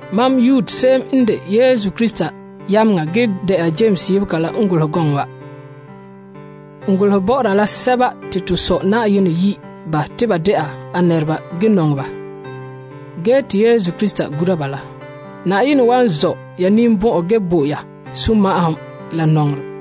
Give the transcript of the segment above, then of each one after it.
Mam Yude se'em n de Yesu Krista yameŋa ge dɛna Yames yebega la n golehɛ gɔŋɔ wa. N golehe bɔ'ɔra la sɛba te to Sɔ' Na'ayenɛ yi' ba te ba dɛna nɛreba ge nɔŋɛ ba ge te Yesu Krista gura ba la. Na'ayenɛ wan zɔ' ya ninbɔn'ɔn ge bo ya sunma'ahom la nɔŋerɛ.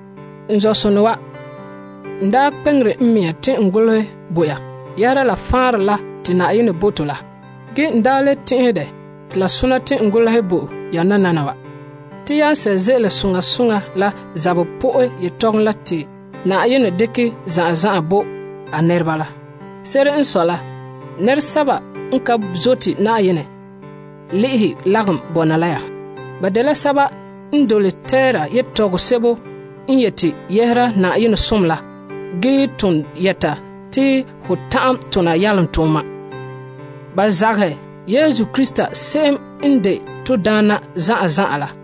N zɔ'sonɔ wa, n daa kpe'eŋere n mɛŋa te n golehɛ bo ya yɛhera la faanrɛ la te Na'ayenɛ bo to la. Ge nananawa n daa le tɛn'ɛhɛ dɛ te la sona te n golehɛ bo ya te ya sɛ' ze'ele soŋa soŋa la zabɛ po'e yetɔgom la te Na'ayenɛ dekɛ zan'an zan'an bo a nɛreba la. Se'ere n sɔe la nɛresɛba n ka zote Na'ayenɛ le'ehɛ lagom bɔna la ya. Ba dela sɛba n dole teera yetɔgom sebo n yeti yɛhera Na'ayenɛ zo'ohogɔ la ge ton yɛta te ho ta'an tona yalomtooma. Ba zagahɛ Yesu Krista se'em n de to Daana zan'an zan'an la.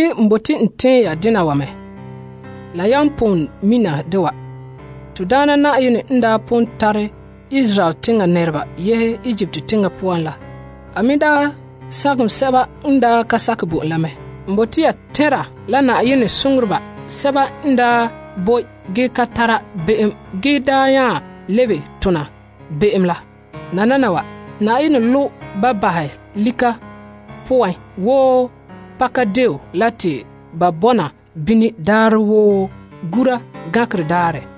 N bote n tɛɛn ya dena wa mɛ ge la yan pon mina dɛ wa. To Daana n daa pon tare a nɛreba yehe Egipt teŋa poan la, ge a me daa sagom basɛba n daa ka sakɛ bo en la mɛ. Ya me mina te Na'ayenɛ soŋoreba basɛba n daa boe ge ka tara be'em ge daa nya lebege tona be'em la. Na'ayenɛ lobe ba bahɛ lika poan wo pakadeen la te ba bɔna bini daarɛ woo gura gankerɛ daarɛ.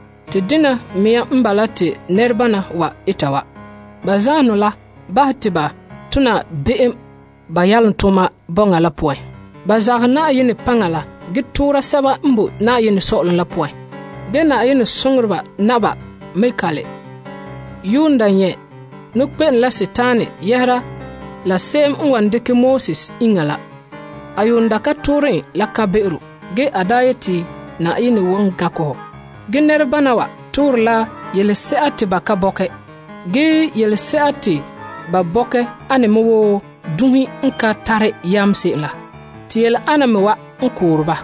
Te dena mea n bala te nɛrebana wa eta wa. Ba zaanheŋɔ la bahɛ ba te ba tona be'em ba yalomtooma bɔŋa la poan. Ba zagahɛ Na'ayenɛ paŋa la ge toora sɛba n boe Na'ayenɛ Sɔ'ɔlom la poan la. Na'ayenɛ soŋoreba Mikael se'em de ba nɛŋadaana la n yuun daa ŋmɛ' nɔkpe'ene la sagona yɛhera la se'em n wan dekɛ Moses iŋa la, a yuun daa ka toore en la kan'be'ero. A daa yeti, Na'ayenɛ wan gankɛ hɔ. Ge nɛrebana wa toore la yelese'a te ba ka bɔkɛ. Yelese'a te ba bɔkɛ ane me wo dunhe n ka tare yam se'em la. Te yele ane me wa n koore ba.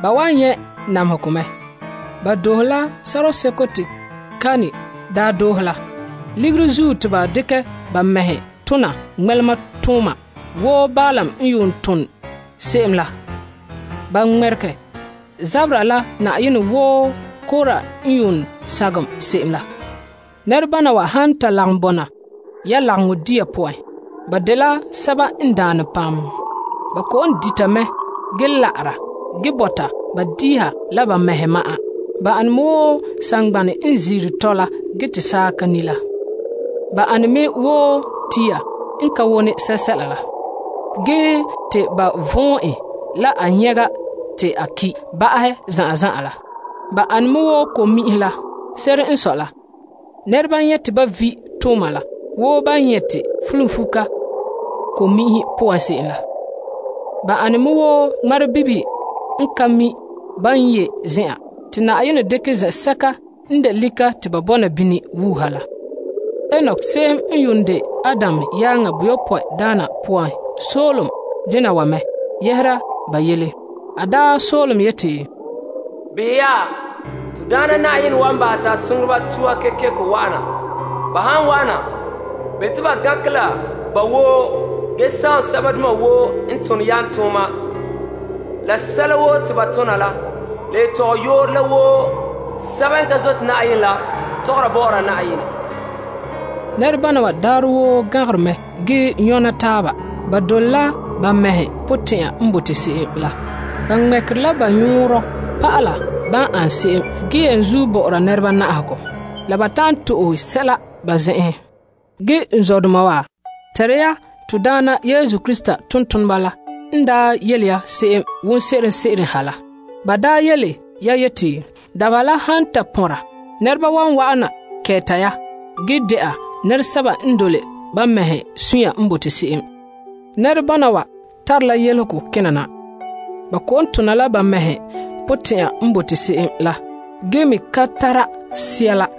Ba wan nyɛ' namehegɔ mɛ. Ba doohe la sɔrɔɔ seko te Kain daa doohe la. Ligiri zuo te ba dekɛ ba mɛhe tona ŋmɛlematooma wo Balaam n yuun tom se'em la. Ba ŋmɛregɛ zabera la Na'ayenɛ wo Kora la, ba mɛ wan nyɛ sagaŋɔ wo enŋa la. Nɛrebana wa han ta lagom bɔna ya lagaŋɔ dia poan, ba dela sɛba n daane. Ba kɔ'ɔn dita mɛ ge la'ara ge bɔta ba diiha la ba mɛhe ma'an. Ba ane me wo saŋgbanɛ n ziire tɔla ge te saaka ni' la. Ba ane me wo tia n ka wone sɛla la, ge te ba vɔn' en la a nyɛga te a ki' ba'ahɛ zan'an zan'an la. Ba ane me wo ko'mi'inhe la. Se'ere n sɔe la, nɛreba nyɛ' te ba vi' tooma la wo ban nyɛ' te fulunfuka ko'mi'inhe poan se'em la. Ba ane me wo ŋmarebibihe n ka mi' ban ye zen'an, te Na'ayenɛ wan dekɛ zen'sɛka n de lika te ba bɔna bini wuuha la. Enok se'em n yuun de Adam yaaŋa boyopɔe daa pon soolom dena wa mɛ yɛhera ba yele. A daa soolom yeti, Behɛ ya, To Daana Na'ayenɛ wa'ana la a soŋoreba tuha kekeko! A han wa'ana, a wan gankɛ la ba woo ge sagom sɛbadoma woo n tone yalomtooma la sɛla woo te ba tona la, la tɔgɔyooro la woo te sɛba n ka zote Na'ayenɛ la tɔgɔra bɔ'ɔra Na'ayenɛ. Nɛrebana wa daarɛ woo gan'angere mɛ ge nyɔna taaba. Ba dole la ba mɛhe potɛn'ɛra n bote se'em la. Ba ŋmɛ'ɛre la ba nyɔn'ɔnrɔ pa'ala ba an se'em ge bɛlegera nɛreba te ba ta'an to'e sɛla. Ge n zɔdoma wa, tɛnra ya to Daana Yesu Krista tontoneba la n daa yele ya se'em wonse'eren ha la. Ba daa yele ya yeti, Dabeha la han ta pɔnra, nɛreba wan wa'ana kɛɛta ge dɛna nɛresɛba n dole ba mɛhe suunre n bote se'em. Nɛrebana wa n tare yelehego kena na. Ba kɔ'ɔn tona la ba mɛhe potɛn'ɛra n bote se'em la ge me ka tara Sea la.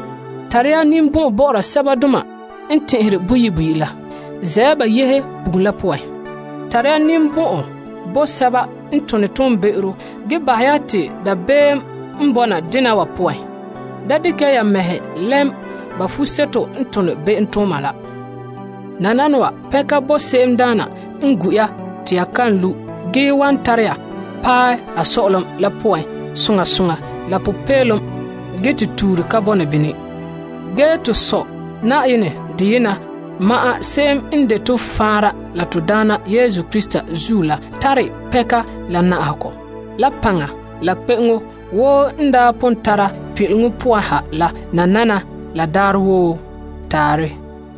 Tare ya ninbɔn'ɔn bɔ'ɔra sɛbadoma n tɛn'ɛhere boyi' boyi' la, la zɛ' ya sɛba yehe bugum la poan la tare ya ninbɔn'ɔn bo sɛba me n tone toonbe'ero. Ge tare ya dabeem yehera ba etegɔ. Da dekɛ ya mɛhe lɛm sɛba n tone be'emtooma la. Nananawa, pɛnka bo se'emdaana n gu' ya te ya kan lu' ge wan tare ya paɛ a nɛŋan na soŋa soŋa la popeelom ge te tuure ka bɔna ya poan. Ge to Sɔ' Na'ayenɛ deyena ma'an, se'em n de to faanra la to Daana Yesu Krista zuo la, tare pɛnka la na'ahegɔ, la paŋa la kpe'eŋo wo n daa pon tara pin'ileŋɔ poan ha la nananawa la daarɛ woo. Taarɛ.